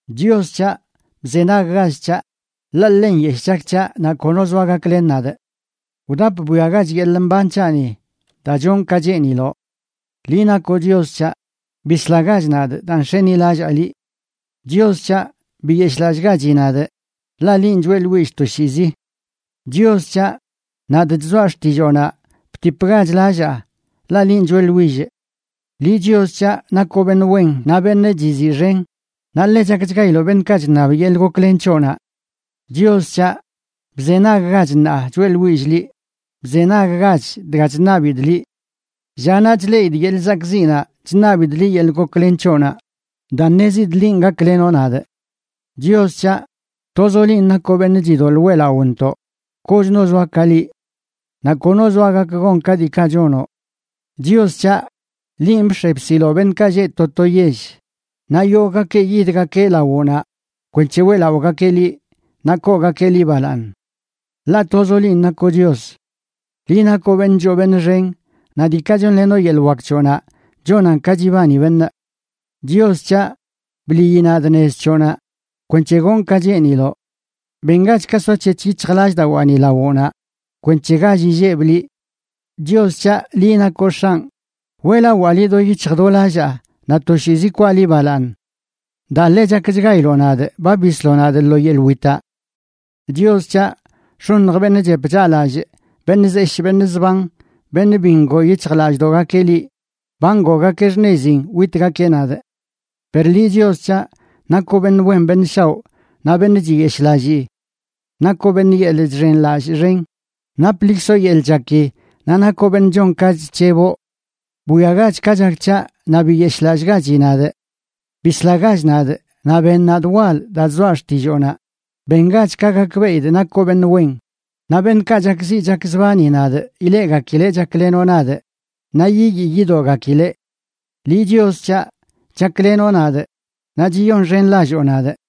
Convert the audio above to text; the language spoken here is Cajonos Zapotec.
Chios c̱haꞌ, bzenaggach c̱haꞌ, ḻaꞌ ḻe nyeshꞌ chak c̱haꞌ naꞌ kono zoa gaklen nadꞌ. Wdap bwiagach yeḻꞌ mban c̱haꞌni, daa chonꞌ ka cheeniloꞌ. Liꞌ nakoꞌ Chios c̱haꞌ, bislagach nadꞌ daa nx̱enilallaa liꞌ. Chios c̱haꞌ, biyeshꞌlallꞌgachi nadꞌ, ḻaꞌ linꞌ choeꞌḻwillꞌ toshiizi. Chios c̱haꞌ, nadꞌ chzoa xtilloonaꞌ, btipgach lallaa, ḻaꞌ linꞌ choeꞌḻwillꞌ. Liꞌ, Chios c̱haꞌ, nakoꞌ beṉꞌ wen naꞌ beṉꞌ chiziꞌxen, naꞌ ḻe chakchgailoꞌ beṉꞌkaꞌ chṉab yeḻꞌ goklen c̱hoꞌnaꞌ. Chios c̱haꞌ, bzenaggach ṉaa choeꞌḻwillꞌ liꞌ, ¡bzenaggach dga chṉabidꞌ liꞌ! Llanaꞌ chleꞌidꞌ yeḻꞌ zakꞌziꞌnaꞌ chṉabidꞌ liꞌ yeḻꞌ goklen c̱hoꞌnaꞌ, daa ṉezidꞌ linꞌ gaklenoꞌ nadꞌ. Chios c̱haꞌ, tozoꞌ linꞌ nakoꞌ beṉꞌ chidoḻꞌ weꞌlaꞌontoꞌ, kochno zoa ka liꞌ. Naꞌ kono zoa gak gon ka diikaꞌ chonoꞌ. Chios c̱haꞌ, linꞌ bx̱e bsiloꞌ beṉꞌkaꞌ lleꞌ to to yell, naꞌ yogꞌgakeꞌ yidgakeꞌ lawoꞌnaꞌ kwenc̱he weꞌlaꞌogakeꞌ liꞌ, naꞌ koogakeꞌ liꞌ balaaṉ. Ḻaꞌ tozoꞌ linꞌ nakoꞌ Chios; ¡liꞌ nakoꞌ beṉꞌ choo beṉꞌ xenꞌ naꞌ diikaꞌ chonlenoꞌ yeḻꞌ wak c̱hoꞌnaꞌ chonan ka chibani beṉꞌ! Chios c̱haꞌ, bliꞌyi nadꞌ nez c̱hoꞌnaꞌ, kwenc̱he gonꞌ ka cheeniloꞌ. Bengach ka soac̱hec̱h yic̱hjlallꞌdawaani lawoꞌnaꞌ, kwenc̱he gall illebꞌ liꞌ. Chios c̱haꞌ, liꞌ nakoꞌ X̱anꞌ, Weꞌlawaa liꞌ do yic̱hj do lallaa naꞌ toshiizi kwaa liꞌ balaaṉ. ¡Daa ḻe chakchgailoꞌ nadꞌ ba bisloꞌ nadꞌ lo yeḻꞌ witaꞌ! Chios c̱haꞌ, x̱oṉj beṉꞌ chep chaꞌlallꞌ, beṉꞌ zeshꞌ beṉꞌ zban, beṉꞌ bi ngoo yic̱hjlallꞌdoꞌgakeꞌ liꞌ, ba ngoogakeꞌ xṉezin witgakeꞌ nadꞌ. Per liꞌ, Chios c̱haꞌ, nakoꞌ beṉꞌ wen beṉꞌ shaoꞌ naꞌ beṉꞌ chiyeshꞌlallii. Nakoꞌ beṉꞌ yeḻꞌ chxenlallꞌ xen, naplikzoꞌ yeḻꞌ chaki, naꞌ nakoꞌ beṉꞌ chon ka chc̱heboꞌ. Bwiagach ka chak c̱haꞌ, naꞌ ¡biyeshꞌlallꞌgachi nadꞌ! Bislagach nadꞌ, naꞌ ben nadꞌ wal, daa chzoaꞌ xtilloonaꞌ. Bengach ka gakbeꞌidꞌ nakoꞌ beṉꞌ wen, naꞌ beṉꞌkaꞌ chakziꞌ chakzbani nadꞌ ileꞌgakileꞌ chaklenoꞌ nadꞌ naꞌ yiyii yidoꞌgakileꞌ. Liꞌ Chios c̱haꞌ, chaklenoꞌ nadꞌ naꞌ chiyonxenlalloo nadꞌ.